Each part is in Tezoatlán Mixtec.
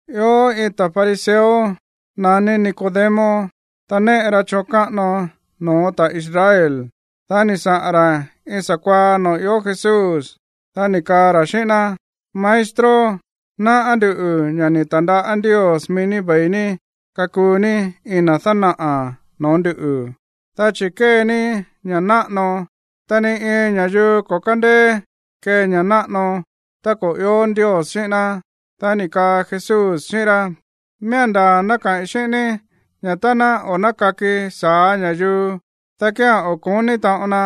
Ió iin ta̱ fariseo naní Nicodemo, ta néꞌe ra choon káꞌano no̱ó ta̱ Israel. Dá ni̱ saꞌa̱n ra̱ iin sa̱kuaá noo̱ ió Jesús, dá ni̱ kaa ra̱ xíꞌín ná: ―Maestro, náꞌá nduꞌu̱ ña̱ ni̱ ta̱ndaꞌá Ndios mií ní ve̱i ní kakuu ní iin na̱ dánaꞌa̱ no̱ó ndu̱, dá chi̱ kée ní ña̱ náꞌano, ta ni iin ña̱yuu ko̱ kándeé kee ña̱ náꞌano tá ko̱ ió Ndios xíꞌín ná. Dá ni̱ kaa Jesús xíꞌín rá: ―Miía̱n ndaa̱ ná kaꞌi̱n xíꞌín ní ña̱ tá ná o̱ nákaki sa̱á ña̱yuu, dá kía̱n o̱ ko̱ní taꞌon na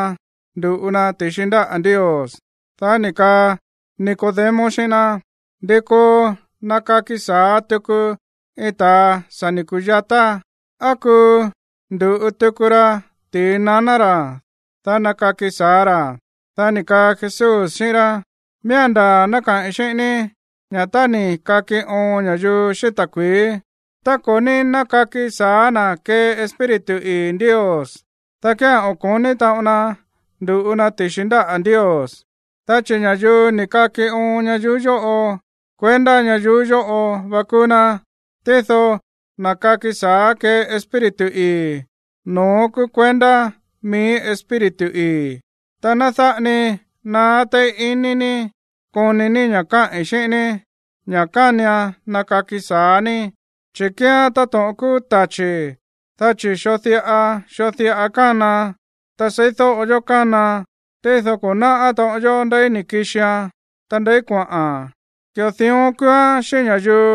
ndu̱ꞌu na ti̱xi ndáꞌa̱ Ndios. Dá ni̱ kaa Nicodemo xíꞌín ná: ―¿Ndi koo nakaki sa̱á tuku iin ta̱a sa̱ ni̱ ku̱yatá? ¿Á kuu ndu̱ꞌu tuku ra ti̱i naná ra̱, dá nakaki sa̱á ra̱? Dá ni̱ kaa Jesús xíꞌín rá: ―Miía̱n ndaa̱ ná kaꞌi̱n xíꞌín ní ña̱ tá ni̱ kaki oon ña̱yuu xíꞌín ta̱kui̱í, ta ko̱ ní nákaki sa̱á na̱ kee Espíritu ii̱ Ndios, dá kía̱n o̱ ko̱ní taꞌon na ndu̱ꞌu na ti̱xi ndáꞌa̱ Ndios. Dá chi̱ ña̱yuu ni̱ kaki oon ñayuú yóꞌo, kuendá ñayuú yóꞌo va kúú ná. Tído na̱ káki sa̱á kée Espíritu ii̱, no̱ón kúú kuendá mií Espíritu ii̱. Ta ná dáꞌa ni naá téí ini ní koni ní ña̱ káꞌi̱n xíꞌín ní ña̱ kánian nakaki sa̱á ní. Chi̱ kíán táto̱ꞌon kúú tachi̱, dá chi̱ xoo diꞌa xoo diꞌa kánaan, ta seídóꞌo yó kánaan, tído ko̱ náꞌá taꞌon yó ndeí ni̱ kixian, ta ndeí kuaꞌa̱n. Ki̱ꞌo dión kúúán xíꞌín ña̱yuu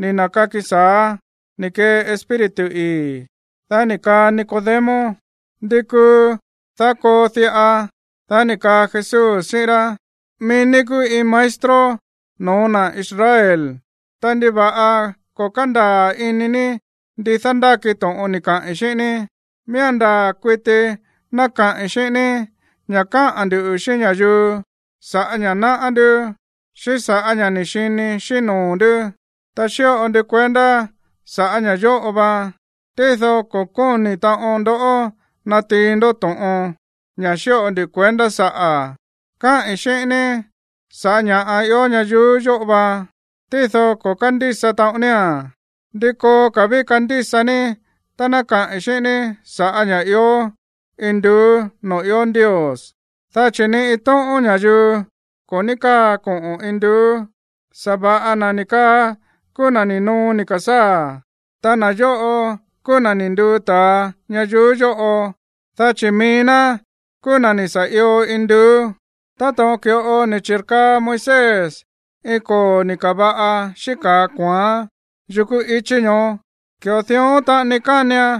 ni̱ na̱kaki sa̱á ni̱ kee Espíritu ii̱. Dá ni̱ kaa Nicodemo: ―¿Ndi kuu, dá koo diꞌa? Dá ni̱ kaa Jesús xíꞌín rá: ―Mií ní kúú iin maestro no̱ó na̱ Israel. Ta, ¿ndiva̱ꞌa ko̱ kándaa̱ ini ní ndi dándáki to̱ꞌon ni̱ kaꞌi̱n xíꞌín ní? Miía̱n ndaa̱ kuiti ná kaꞌi̱n xíꞌín ní ña̱ káꞌa̱n ndu̱ xíꞌín ña̱yuu sa̱ꞌá ña̱ náꞌá ndú, xíꞌín sa̱ꞌá ña̱ ni̱ xini xíꞌín noo̱ ndú. Ta xíꞌo ndu kuendá sa̱ꞌá ña̱ yóꞌo va, tído ko̱ kóni̱ taꞌon ndoꞌó natiin ndó to̱ꞌon, ña̱ xíꞌo ndu kuendá saꞌa̱. Káꞌi̱n xíꞌín ní sa̱ꞌá ña̱ꞌa ió ñayuú yóꞌo va, tído ko̱ kándísa taꞌon nía̱n. ¿Ndi koo ka̱ ví kandísa ní tá ná kaꞌi̱n xíꞌín ní sa̱ꞌá ña̱ꞌa ió induú noo̱ ió Ndios? Dá chi̱ ni iin tóꞌón ña̱yuu ko̱ ní káa koꞌo̱n induú. Sa̱va̱ꞌa na̱ ni̱ kaa kúú na̱ ni̱ noo ni̱ ka̱sáa̱. Ta na̱ yóꞌo kúú na̱ ni̱ nduu ta̱a ñayuú yóꞌo, dá chi̱ mií ná kúú na̱ ni̱ sa̱ io induú. Táto̱ꞌon ki̱ꞌo ni̱ chi̱rkaa Moisés iin koo̱ ni̱ ka̱va̱ꞌa xíꞌín ka̱a kua̱án yukú i̱chí ñoó, ki̱ꞌo dión taꞌani kánian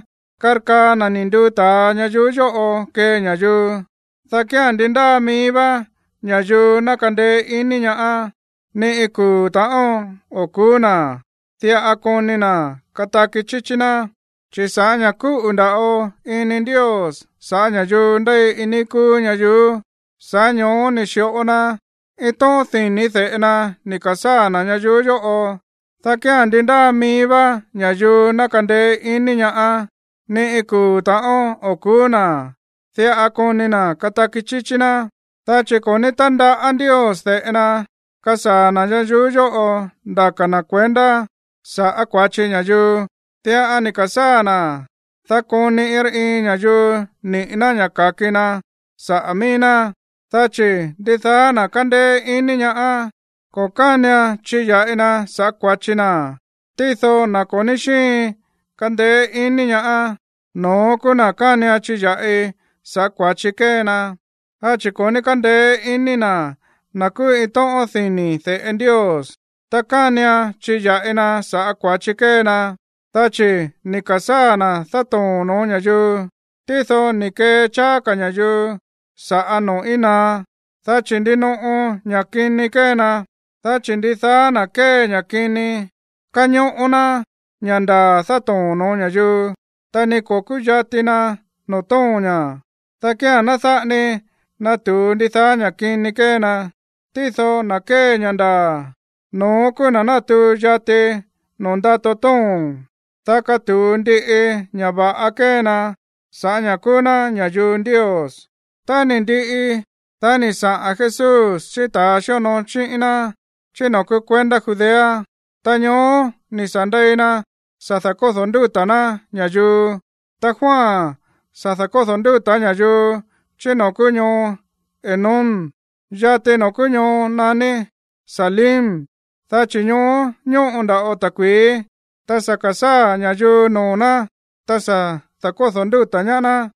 karkaa na̱ ni̱ nduu ta̱a ñayuú yóꞌo kee ña̱yuu, dá kía̱n ndi ndáa mií vá ña̱yuu ná kandeé ini ñaá, ni iin kuu̱ ta̱ꞌón o̱ ku̱ú na̱, diꞌa koni na̱ kataki chíchí ná. ’Chi̱ sa̱ꞌá ña̱ kúꞌu̱ nda̱ꞌo ini Ndios sa̱ꞌá ña̱yuu ndéi iin níí kúú ñayuú, sa̱ꞌá ño̱ó ni̱ xi̱ꞌo na iin tóꞌón dini̱ de̱ꞌe na ni̱ ka̱sáa̱ na̱ ñayuú yóꞌo, dá kía̱n ndi ndáa mií vá ña̱yuu ná kandeé ini ñaá, ni iin kuu̱ ta̱ꞌón o̱ ku̱ú na̱. Diꞌa koni na̱ kataki chíchí ná. Dá chi̱ ko̱ ní tándaꞌá Ndios de̱ꞌe na kasaa̱ na̱ ñayuú yóꞌo ndaka na kuendá sa̱ꞌá kua̱chi ña̱yuu. Diꞌa ni̱ ka̱sáa̱ na̱, dá koni iin rá iin ña̱yuu niꞌi̱ ná ña̱ ka̱ki na sa̱ꞌá mií ná. ’Dá chi̱ ndidaá na̱ kándéé ini ñaá, ko̱ kánian chiya̱ꞌi na sa̱ꞌá kua̱chi na. Tído na̱ ko̱ ní xíin kandeé ini ñaá, no̱ón kúú na̱ kánian chiya̱ꞌi saꞌa̱ kua̱chi kée na, dá chi̱ ko̱ ní kándeé ini na̱ na̱ kúú iin tóꞌón dini̱ de̱ꞌe Ndios. Ta kánian chiya̱ꞌi na sa̱ꞌá kua̱chi kée na, dá chi̱ ni̱ ka̱sáa̱ na̱ dátoo̱n noo̱ ña̱yuu, tído ni̱ kee cháá ka̱ ña̱yuu sa̱ꞌá noo̱ íin naá, dá chi̱ ndinoꞌo ña̱ kini kée na. Dá chi̱ ndidaá na̱ kée ña̱ kini, kañóꞌó ná ña̱ ndaa̱ dátoo̱n no̱ó ña̱yuu, ta ni ko̱ kúyati na noo̱ tóo̱n ña̱, dá kía̱n ná dáꞌa ni natu̱u ndidaá ña̱ kini kée na. Tído na̱ kée ña̱ ndaa̱, no̱ón kúú na̱ na̱tuu yati noo̱ ndato tóo̱n, dá katu̱u ndiꞌi ña̱ va̱ꞌa kée na sa̱ꞌá ña̱ kúú ná ña̱yuu Ndios. Tá ni̱ ndiꞌi, dá ni̱ saꞌa̱n Jesús xíꞌín ta̱ xíonoo xíꞌín ná chí noo̱ kúú kuendá Judea, ta ñoó ni̱ sa̱ ndei na sa̱ da̱kódo̱ ndúta̱ ná ña̱yuu. Ta Juan sa̱ da̱kódo̱ ndúta̱ ña̱yuu chí noo̱ kúú ñoo Enón, yati noo̱ kúú ñoo naní Salim, dá chi̱ ñoó ñóꞌo nda̱ꞌo ta̱kui̱í. Ta sa̱ ka̱sáa̱ ña̱yuu noo̱ ná, ta sa̱ da̱kódo̱ ndúta̱ ñaá ná,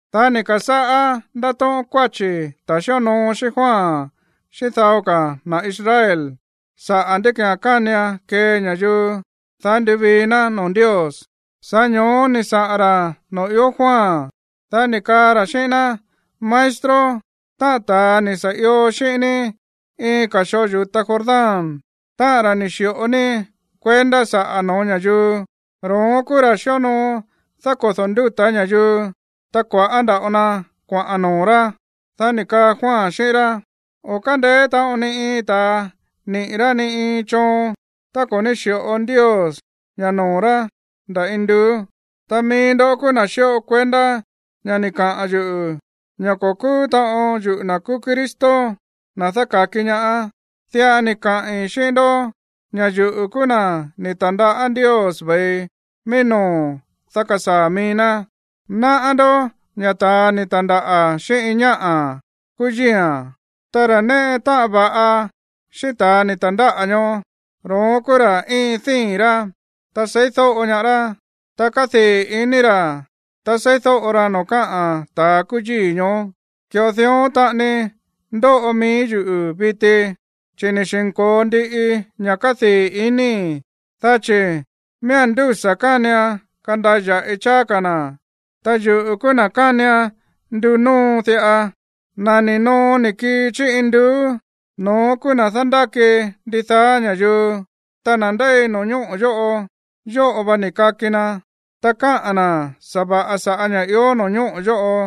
Dá ni̱ ka̱sáꞌá ndátóꞌón kuáchi̱ ta̱ xíonoo xíꞌín Juan xíꞌín dao ka̱ na̱ Israel saꞌa̱ ndí ki̱án kánian kee ña̱yuu, dá nduvii ná noo̱ Ndios. Sa̱ꞌá ño̱ó ni̱ saꞌa̱n ra̱ noo̱ ió Juan, dá ni̱ kaa ra̱ xíꞌín ná: ―Maestro, táꞌa̱n ta̱a ni̱ sa̱ io xíꞌín ní iin ka̱ xoo yu̱ta Jordán, táꞌa̱n ra̱ ni̱ xi̱ꞌo ní kuendá sa̱ꞌá no̱ó ña̱yuu, ro̱ón kúú ra̱ xíonoo dákodo̱ ndúta̱ ña̱yuu, ta kua̱ꞌá nda̱ꞌo na kuaꞌa̱n noo̱ rá. Dá ni̱ kaa Juan xíꞌín rá: ―O̱ kándeé taꞌon ni iin ta̱a niꞌi̱ rá ni iin choon tá ko̱ ní xi̱ꞌo Ndios ña̱ noo̱ rá nda̱ induú. Ta mií ndó kúú na̱ xíꞌo kuendá ña̱ ni̱ kaꞌa̱n yuꞌu̱ ña̱ ko̱ kúú taꞌon yuꞌu̱ na̱ kúú Cristo, na̱ dáka̱ki ñaá. Diꞌa ni̱ kaꞌi̱n xíꞌín ndó ña̱ yuꞌu̱ kúú na̱ ni̱ ta̱ndaꞌá Ndios ve̱i mií no̱ó, dá kasaa̱ mií ná. Náꞌá ndó ña̱ ta̱a ni̱ ta̱ndáꞌa̱ xíꞌín iin ñáꞌa̱ kúú yíi̱a̱n. Ta ra̱ néꞌe táꞌan va̱ꞌa xíꞌín ta̱ ni̱ ta̱ndáꞌa̱ ñoó, ro̱ón kúú ra̱ íin díi̱n rá, ta seídóꞌo ñaá rá, ta kádii̱ ini ra̱ tá seídóꞌo ra noo̱ káꞌa̱n ta̱ kúú yíi̱ ñoó. Ki̱ꞌo dión taꞌani ndóꞌo mií yuꞌu̱ viti, chi̱ ni̱ xi̱nko̱o ndiꞌi ña̱ kádii̱ inii̱. Dá chi̱ miía̱n ndúsa̱ kánian kandaya̱ꞌi cháá ka̱ na̱, ta yuꞌu̱ kúú na̱ kánian ndunóo diꞌa. ’Na̱ ni̱ noo ni̱ kii chí induú, no̱ón kúú na̱ dándáki ndidaá ña̱yuu. Ta na̱ ndéi no̱ñóꞌo̱ yóꞌo, yóꞌo va ni̱ kaki na, ta káꞌa̱n na̱ sa̱va̱ꞌa sa̱ꞌá ña̱ ió no̱ñóꞌo̱ yóꞌo.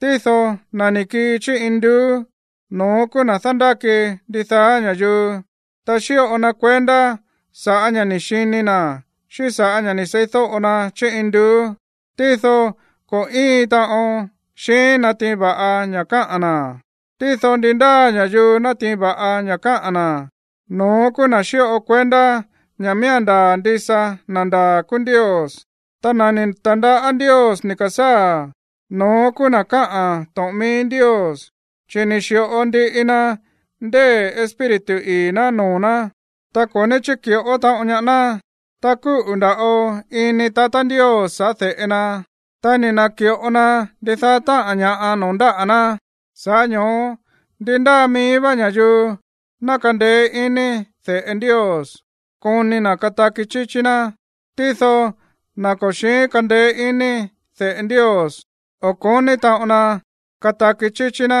Tído na̱ ni̱ kii chí induú, no̱ón kúú na̱ dándáki ndidaá ña̱yuu. Ta xíꞌo na kuendá sa̱ꞌá ña̱ ni̱ xini na̱ xíꞌín sa̱ꞌá ña̱ ni̱ seídóꞌo na chí induú, tído ko̱ íin taꞌon xiín natiin va̱ꞌa ña̱ káꞌa̱n na̱. Tído ndi ndáa ña̱yuu nátiin va̱ꞌa ña̱ káꞌa̱n na̱, no̱ón kúú na̱ xíꞌo kuendá ña̱ miía̱n ndaa̱ ndisa na̱ ndaa̱ kúú Ndios. Ta na̱ ni̱ ta̱ndaꞌá Ndios ni̱ ka̱sáa̱, no̱ón kúú na̱ káꞌa̱n to̱ꞌon mií Ndios, chi̱ ni̱ xi̱ꞌo ndiꞌi na ndée̱ Espíritu ii̱ ná noo̱ ná, ta ko̱ ní chíki̱ꞌó taꞌon ñaá ná. Ta kúꞌu̱ nda̱ꞌo ini tatá Ndios saꞌa̱ de̱ꞌe na, ta ni̱ na̱ki̱ꞌo na ndidaá táꞌa̱n ña̱ꞌa noo̱ ndáꞌa̱ ná. Sa̱ꞌá ño̱ó ndi ndáa mií vá ña̱yuu ná kandeé ini de̱ꞌe Ndios koni na̱ kataki chíchí ná. Tído na̱ ko̱ xi̱ín kandeé ini de̱ꞌe Ndios, o̱ ko̱ní taꞌon na kataki chíchí ná,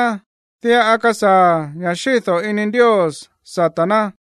diꞌa kasaa̱ ña̱ xído̱ ini Ndios sata̱ ná.